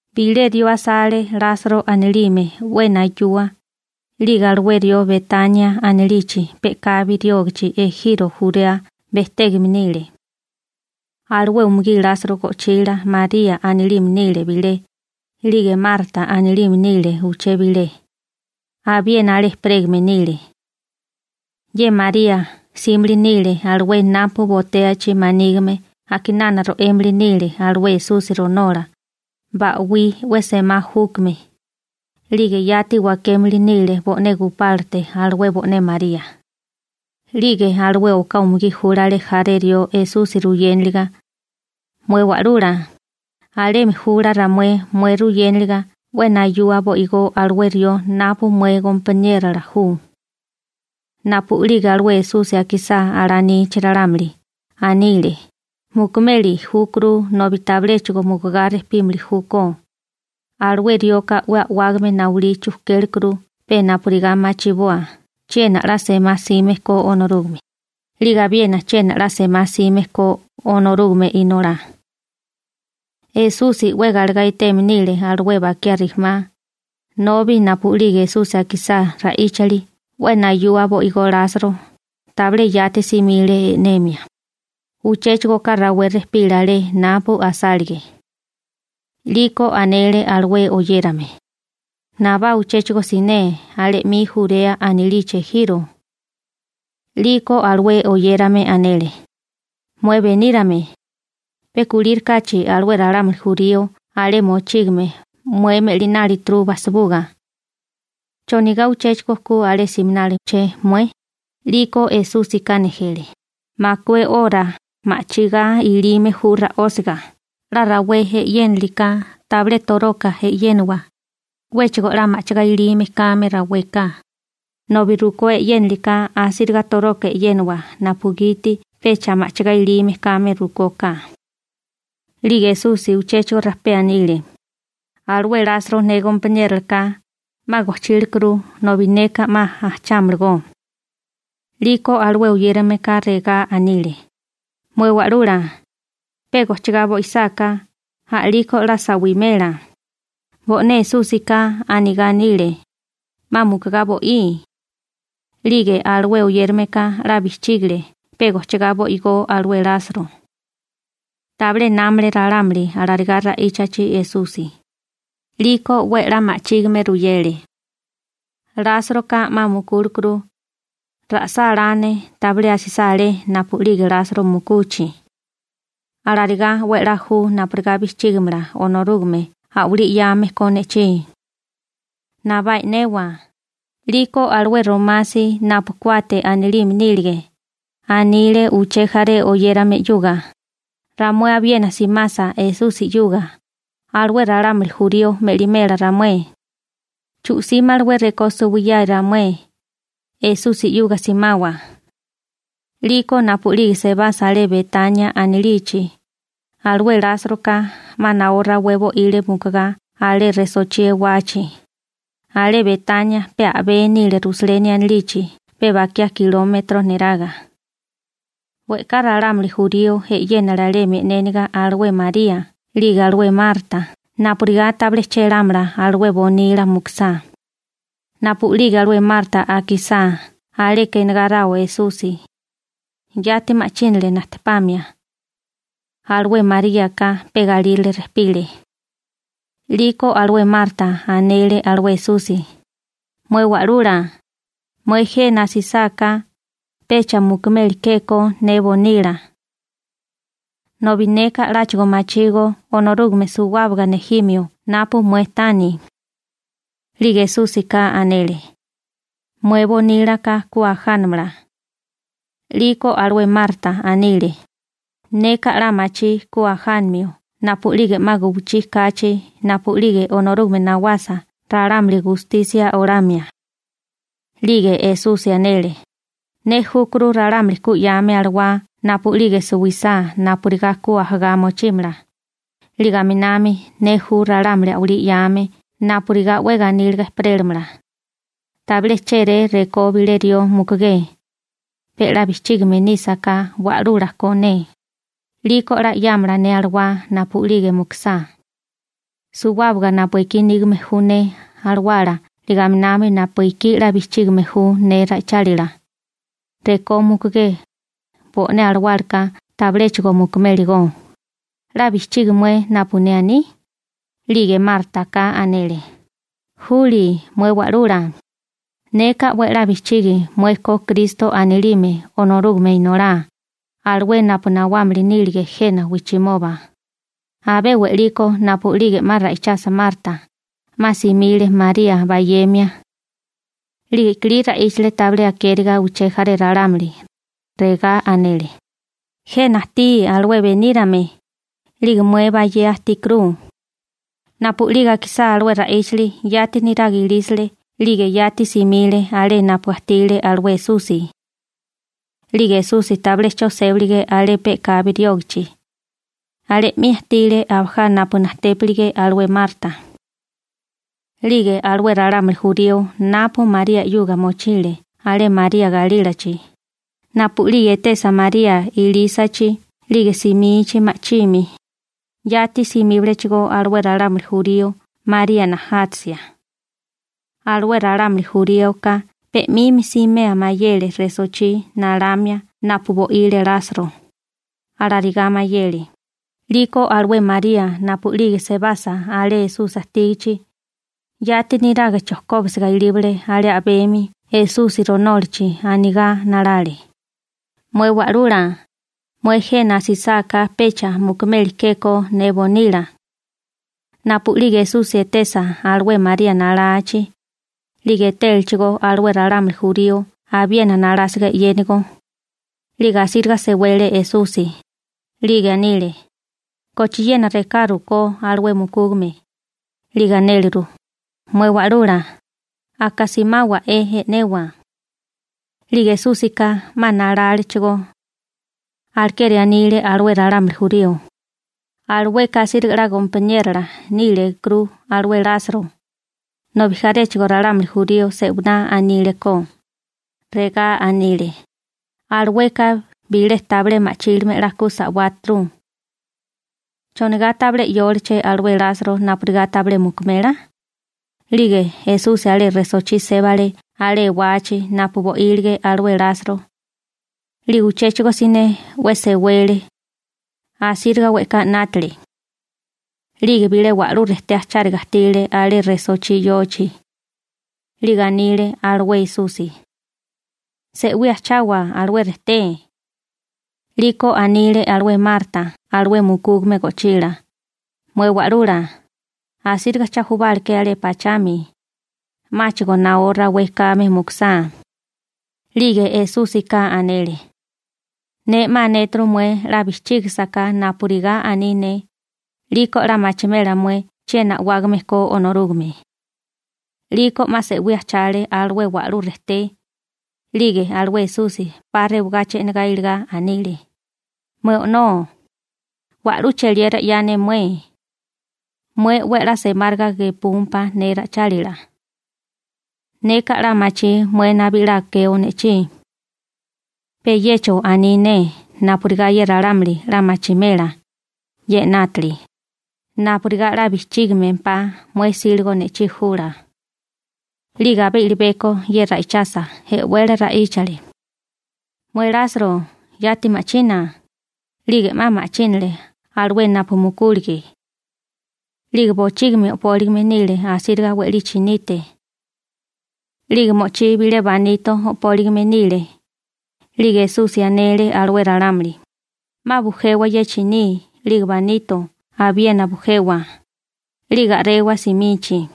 Bilé rió asale Lasro anilime, 'we nayua, 'lige alué rió Betania anilichi pe'kabi riógichi ejiro Jurea bejtégame nile. Alué umugí Lasro go'chila María anilime nile bilé, 'lige Marta anilime nile uché bilé, abiena alé ejperégame nile. Ye María 'símili nile alué napu botéachi manígime a'kinana ro'émili nile alué Esusi ronola, ba'wí 'we semá júkame, 'lige yati wakémili nile bo'né gupálate alué bo'né María. 'Lige alué oká umugí júlale jaré rió Esusi ruyéniliga: ―Mué Wa'lula, alemi jula ramué mué ruyénaliga 'we nayua bo'igó alué rió napu mué gompaniérola ju. Napu'lige alué Esusi akisá alanichi ralámuli, anile: ―Mukumeli júkuru nobi tabiléchigo mukugá rejpímili júkó. Alué rioka 'we a'wágame nayulí chujkélekuru pe napurigá machiboa chiena 'la semá 'sime ko Onorúgame, 'lige abiena chiena 'la semá 'sime ko Onorúgame Inolá. Esusi 'we galegá eteme nile alué bakiá rijimá, nobi napu'lige Esusi akisá ra'íchali 'we nayua bo'igó Lasro, tabilé yati simile e'nemia, uchéchigo oká rawé rejpile alé napu asálige. 'Liko anele alué oyérame: ―Nabá uchéchigo siné alé 'mi Jurea anilichi ejiro. 'Liko alué oyérame anele: ―Mué Benírame, pe kulírikáchi alué ralámuli jurío alé mochígame mué me'linálituru bajsibuga. ¿Chonigá uchéchigo ku alé siminali che mué? 'Liko Esúsika nejele: ―Makué oká 'ora ma'chigá ilime ju ra'ósiga. 'La rawé e'yéniliká tabilé toroka e'yéniwa 'wéchigo 'la ma'chigá ilime kame raweka. Rukó e'yéniliká asíriga toroka e'yéniwa napugiti pecha ma'chigá ilime kame rukóká. 'Lige Esusi uchéchigo rajpé anile: ―Alué Lasro ne gompaniérola ka, 'ma gojchílekuru, nobi neka 'ma ajchámalagó. 'Liko alué oyérameka regá anile: ―Mué Wa'lula, ¿pe gojchigá bo'isáká, a'liko 'la sa'wimela? Bo'né Esúsika anigá anile: «'Ma mukugá bo'í.» 'Lige alué oyérameka 'la bijchígale pe gojchigá bo'igó alué Lasro. Tabilé námale ralámuli alarigá ra'íchachi Esusi. 'Liko 'we a'lá ma'chígime ruyele: ―Lásroka 'ma mukúlekuru. Ra'sá la ne tabilé asisá alé napu'lige Lasro mukuchi. Alarigá 'we a'lá ju napurigá bijchígimala Onorúgame a'walí 'yame ko ne'chí. Nabá e'newa. 'Liko alué Romasi napu Kuate anilime nílige, anile uché jaré oyérame 'yuga: ―Ramué abiena simasa Esusi 'yuga, alué ralámuli jurío me'limela ramué. Chu'símalawé rekó suwiyae ramué, Esusi 'yuga simawa. 'Liko napu'lige sebasa alé Betania anilichi, alué Lásroka 'ma naó rawé bo'ile mukugá alé resochí ewachi. Alé Betania pe a'bé nile Rusaleni anilichi pe bakiá kilómetro niraga. We'ká ralámuli jurío e'yénale alemi e'néniga alué María 'lige alué Marta napurigá tabilé chélámala alué bonila mukusá. Napu'lige alué Marta akisá aleka enegáráo Esusi, yati ma'chínale najtepamia. Alué Maríaka pe galírale rejpile. 'Liko alué Marta anele alué Esusi: ―Mué Wa'lula, mué jena asisáká, pecha mukumeli ke ko ne bonila. Nobi neka 'láchigo machígó Onorúgame suwábaga nejimio napu mué tani. 'Lige Esúsika anele: ―Mué bonílaka ku ajánamala. 'Liko alué Marta anile: ―Neka 'la machí ku ajánimio napu'lige 'ma guwichí kachi napu'lige Onorúgame nawasa ralámuli gustisia olamia. 'Lige Esusi anele: ―Ne júkuru ralámuli ku 'yáame alawá napu'lige suwisá napurigá ku ajagá mochímala, 'lige aminami ne ju ralámuli a'walí 'yame napurigá 'we ganíliga ejperélamala. Tabilé chéré rekó bilé rió mukugé, pe 'la bijchígame nísaká Wa'lula ko ne, 'liko 'la 'yámala ne alawá napu'lige mukusá. Suwábaga napu ekí nígame ju ne alawala 'lige aminami napu ekí 'la bijchígime ju ne ra'ichálila, rekó mukugé, bo'né alawálaka tabiléchigo mukuméligó. ¿'La bijchigi mué napu ne aní? 'Lige Mártaka anele: ―Juli mué wa'lula, neka 'we a'lá bijchigi mué ko Kristo anilime Onorúgame Inolá, alué napu nawámili nílige jena wijchimoba. Abé we'liko napu'lige 'ma ra'ichasa Marta, 'ma simile María bayemia. 'Lige i'kilí ra'íchale tabilé akériga uché jaré ralámuli. Regá anele: ―Jena ajtí alué benírame, 'lige mué bayea ajtíkuru. Napu'lige akisá alué ra'íchali yati niraga ilísale 'lige yati simile alé napu ajtile alué Esusi. 'Lige Esusi tabilé 'cho sébalige alé pe'kabi riógichi, alé 'mi ajtile abajá napu najtépilige alué Marta. 'Lige alué ralámuli jurío napu María 'yuga mochile alé María galílachi, napu'lige etesa María ilísachi 'lige simichi ma'chimi, yati simíbalechigó alué ralámuli jurío María najátasia. Alué ralámuli juríoka pe 'mimi simea mayele resochí nalamia napu bo'ile Lasro, alarigá mayele. 'Liko alué María napu'lige sebasa alé Esusi ajtígichi, yati niraga chojkóbisiga ilíbale alé a'bemi Esusi ronólachi anigá nalale: ―Mué Wa'lula, mué jena asisáká pecha mukumeli ke ko ne bonila. Napu'lige Esusi etesa alué María nalachi, 'lige etélechigó alué ralámuli jurío abiena nalásiga e'yénigo, 'lige asíriga sewele Esusi, 'lige anile: ―¿Kochiena rekaru ko alué mukúgame? 'Lige anéleru: ―Mué Wa'lula, aka simáwa'é e'newa. 'Lige Esúsika 'ma nalálechigó. Alekeri anile alué ralámuli jurío: ―Alueka asíriga 'la gompaniérola níligekuru alué Lasro. Nobi jaréchigo ralámuli jurío se'winá anile ko, regá anile: ―Alueka bilé tabilé ma'chílime 'la ku sa'wáturu. ¿Chonigá tabilé 'yóleché alué Lasro napurigá tabilé mukumela? 'Lige Esusi alé resochí sébale alé ewachi napu bo'ílige alué Lasro, 'lige uchéchigo siné 'we sewele, asíriga we'ká 'nátale. 'Lige bilé wa'lú rejté ajcháriga ajtile alé resochí yochi. 'Lige anile alué Esusi: ―Se'wí ajchawa alué rejté. 'Liko anile alué Marta alué mukúgame go'chila: ―Mué Wa'lula, asíriga cha jubáleké alé pachami, 'máchigo naó rawé kame mukusá. 'Lige Esúsika anele: ―Ne 'ma anéturu mué 'la bijchígasaká napurigá aní ne, 'liko 'la machimela mué chiena a'wágame ko Onorúgame. 'Liko 'ma se'wí ajchale alué wa'lú rejté. 'Lige alué Esusi 'pa rewagachi e'negá iligá anile: ―Mué O'nó, wa'lú cheliera 'ya ne mué, mué 'we a'lá semáriga gepúmpá ne ra'ichálila. Neka 'la machí mué nabí 'la akeo ne'chí. Pe yecho aní ne napurigá ye ralámuli 'la machimela ye 'nátili, napurigá 'la bijchígimempá mué 'síligo ne'chí jula. 'Lige abé i'libeko ye ra'ichasa, e'wele ra'íchale: ―¡Mué Lasro, yati ma'china! 'Lige 'ma ma'chínale alué napu mukúlige. 'Lige bochígimi o'póligime nile asíriga we'lí chinite. 'Lige mo'chí bilé banito o'póligime nile. 'Lige Esusi anele alué ralámuli: ―'Ma bujewa ye chiní 'lige banito abiena bujewa, 'lige a'rewa simichi.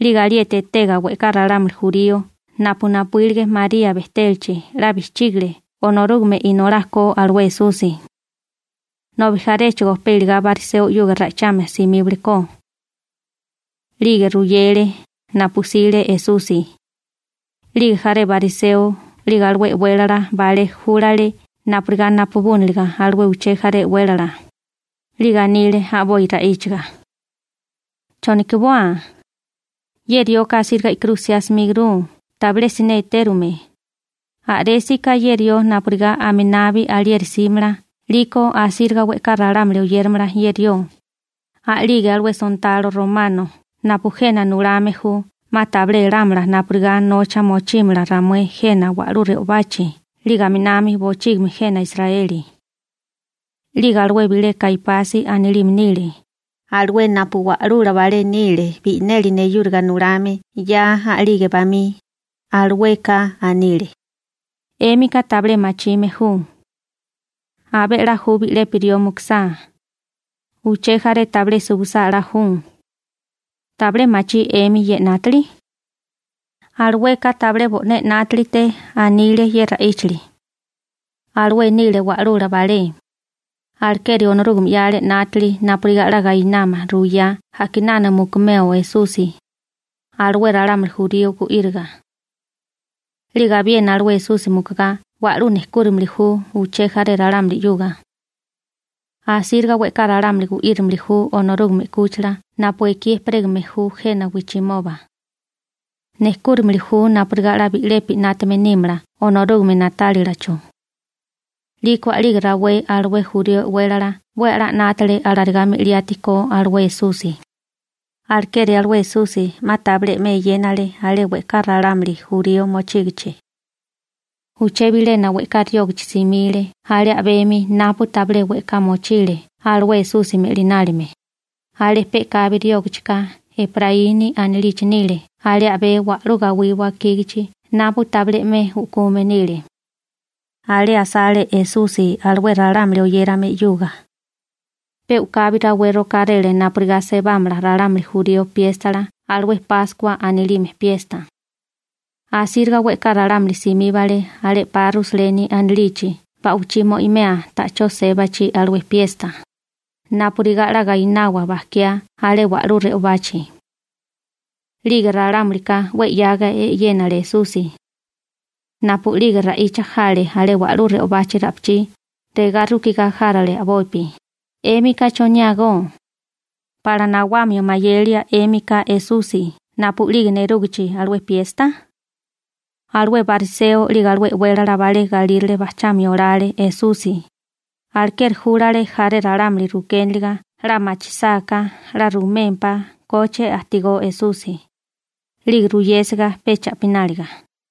'Lige alieti etega we'ká ralámuli jurío napu napuílige María bejtélachi 'la bijchígale Onorúgame Inolá ko alué Esusi. Nobi jaréchigo pe iligá bariseo 'yuga ra'ichamia simíbale ko. 'Lige ruyele napu 'sile Esusi. 'Lige jaré bariseo 'lige alué e'wélala balé júlale napurigá napabúniliga alué uché jaré e'wélala, 'lige anile a'boi ra'íchaga: ―¿Chonokiboa? Ye rioka asíriga i'kirú 'siá simíguru tabilé siné etérume. A'résaká ye rió napurigá aminabi alieri 'símala 'liko asíriga we'ká ralámuli oyéramala ye rió, a'lige alué sontalo romano napu jena nulame ju 'ma tabilé elámala napurigá nocha mochímala ramué jena wa'lú re'obachi 'lige aminami bochígimi jena Israeli. 'Lige alué bilé Kaipasi anilime nile, alué napu wa'lula balé nile bi'neli neyúriga nulame 'ya a'lige bamí, alueka anile: ―'Émika tabilé machime ju. Abé 'la ju bi'lepi rió mukusá, uché jaré tabilé suwisá 'la ju. ¿Tabilé machí 'emi ye 'nátili? Alueka tabilé bo'né 'nátalite anile ye ra'íchali. Alué nile wa'lula balé, alekeri Onorúgame 'yale 'nátili napurigá 'la gainámala ruiyá a'kinana mukumeo Esusi alué ralámuli jurío gu'íriga. 'Lige abiena alué Esusi mukugá wa'lú nejkúramili ju uché jaré ralámuli 'yuga. Asíriga we'ká ralámuli gu'írimili ju Onorúgame 'kúchila napu ekí ejperégame ju jena wijchimoba. Nejkúramili ju napurigá 'la bi'lepi 'nátame nímala Onorúgame na'tálilacho. 'Liko a'lige rawé alué jurío e'wélala 'we a'lá 'nátale alarigá me'liati ko alué Esusi. Alekeri alué Esusi 'ma tabilé 'me eyénale alé we'ká ralámuli jurío mochígichi. Uché bilena we'ká riógichi simile alé a'bemi napu tabilé we'ká mochile alué Esusi me'linálime, alé pe'kabi riógachika Epraíni anilichi nile alé a'bé wa'lú gawí wakígachi napu tabilé 'me u'kume nile. Alé asale Esusi alué ralámuli oyérame 'yuga. Pe u'kabi rawé rokáréle napurigá sebámala ralámuli jurío piéstala alué Páskua anilime piesta. Asíriga we'ká ralámuli simíbale alé 'pa Rusaleni anilichi ba'wichí mo'imea ta'chó sébachi alué piesta, napurigá 'la gainawa bajkiá alé wa'lú re'obachi. 'Lige ralámulika 'we 'yaga e'yénale Esusi. Napu'lige ra'icha jale alé wa'lú re'obachi ra'pichí, regá rukigá járale a'bopi: ―¿'Émika choniágó? ¿Pala nawamio mayelia 'émika Esusi napu'lige nerúgichi alué piesta? Alué bariseo 'lige alué e'wélala balé galírale bajchamio olale Esusi, alekeri júlale jaré ralámuli rukéniliga 'la machisáká 'la rumémpá koche ajtigó Esusi, 'lige ruyésiga pe cha'pináliga.